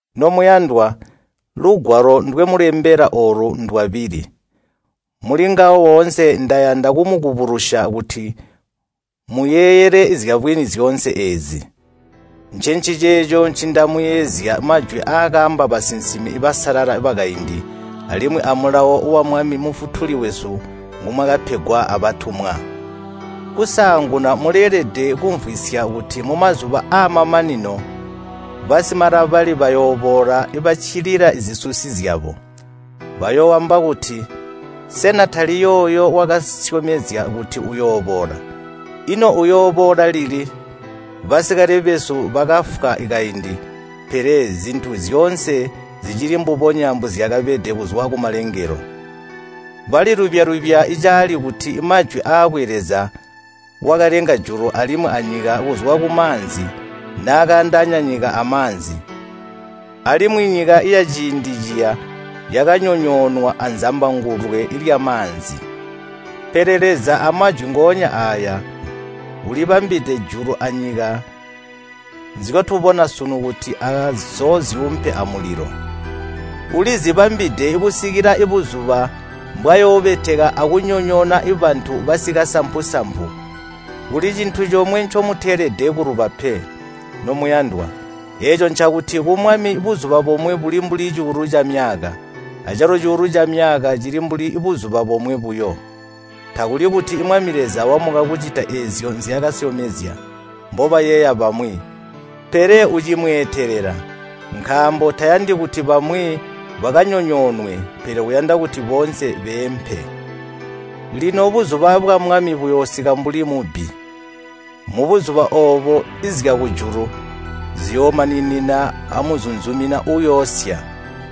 Nomuyandwa, lugwalo ndwemulembela oolu ndwabili. Mulingawo oonse ndayanda kumubukulusya kuti muyeeyele zyabwini zyoonse eezi. Ncenciceeco ncindamuyeezya majwi aakaamba basinsimi basalala bakaindi alimwi amulawo wa Mwami Mufutuli wesu ngumwakapegwa abatumwa. Kusaanguna muleelede kumvwisya kuti mumazuba aamamanino basimalabali bayooboola baccilila zisusi zyabo. Bayooamba kuti, “Sena tali yooyo wakasyomezya kuti uyooboola? Ino uyooboola lili? Basikale besu bakafwa kaindi, pele zintu zyoonse zicili mbubonya mbozyakabede kuzwa kumalengelo.” Balilubya-lubya caali kuti amajwi aakwe Leza wakalenga julu alimwi anyika kuzwa kumaanzi naakaandaanya nyika amaanzi. Alimwi nyika yaciindi ciya yakanyonyoonwa azambangulwe lyamaanzi. Pele Leza amajwi ngoonya aaya ulibambide julu anyika nzyotubona sunu kuti azoozyuumpe amulilo. Ulizibambide kusikila buzuba mbwayoobeteka akunyonyoona bantu basikasampu-sampu. Kuli cintu comwe ncemuteelede kuluba pe, nomuyandwa, eeco ncakuti ku Mwami buzuba bomwe buli mbuli cuulu camyaka, acalo cuulu camyaka cili mbuli buzuba bomwe buyo. Takuli kuti Mwami Leza wamuka kucita eezyo nzyaakasyomezya, mbobayeeya bamwi, pele ucimweetelela, nkaambo tayandi kuti bamwi bakanyonyoonwe, pele uyanda kuti boonse beempe. Lino buzuba bwa Mwami buyoosika mbuli mubbi. Mubuzuba oobo zyakujulu ziyoomaninina amuzunzumina uuyoosya.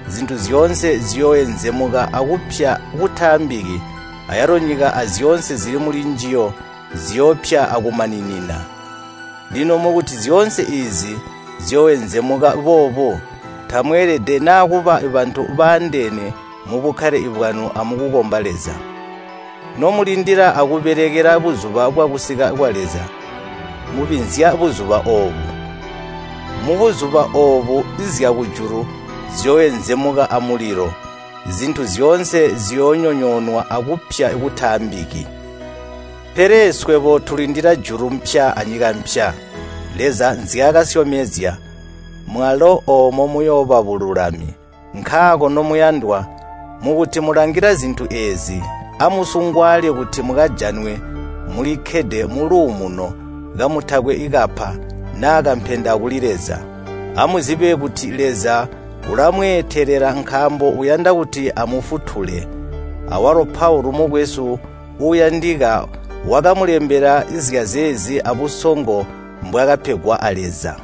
Zintu zyoonse ziyooenzemuka akupya kutaambiki, ayalo nyika azyoonse zili mulinjiyo ziyoopya akumaninina! Lino mukuti zyoonse eezi ziyooenzemuka boobu, tamweelede na kuba bantu baandeene mubukkale bwanu amukukomba Leza? Nomulindila akubelekela buzuba bwakusika kwa Leza, mubinzya buzuba oobo. Mubuzuba oobo zyakujulu ziyooenzemuka amulilo, zintu zyoonse ziyoonyonyoonwa akupya kutaambiki. Pele swebo tulindila julu pya anyika mpya, Leza nzyaakasyomezya, mwalo oomo muyooba bululami. Nkaako, nomuyandwa, mukuti mulangila zintu eezi, amusungwaale kuti mukajanwe mulikkede muluumuno, kamutakwe kapa, naa kampenda kuli Leza. Amuzibe kuti Leza ulamweetelela nkaambo uyanda kuti amufutule. Awalo Paulu mukwesu uuyandika wakamulembela zyazeezi abusongo mbwaakapegwa a Leza.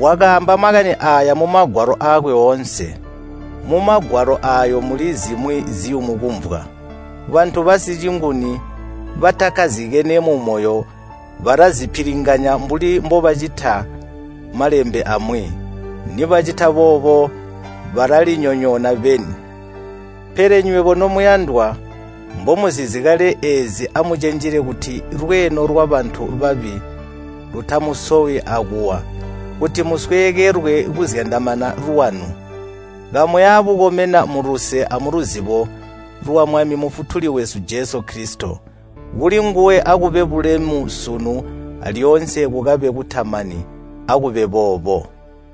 Wakaamba makani aaya mumagwalo aakwe oonse. Mumagwalo aayo muli zimwi ziyumu kumvwa. Bantu basicinguni batakkazikene mumoyo balazipilinganya mbuli mbobacita Malembe amwi. Nibacita boobo balalinyonyoona beni. Pele nywebo nomuyandwa, mbomuzizi kale eezi amucenjele kuti lweeno lwabantu babi lutamusowi akuwa, kuti musweekelwe kuzyandamana lwanu. Kamuya bukomena muluse amuluzibo lwa Mwami Mufutuli wesu Jesu Kilisito. Kulinguwe akube bulemu sunu alyoonse kukabe kutamani. Akube boobo.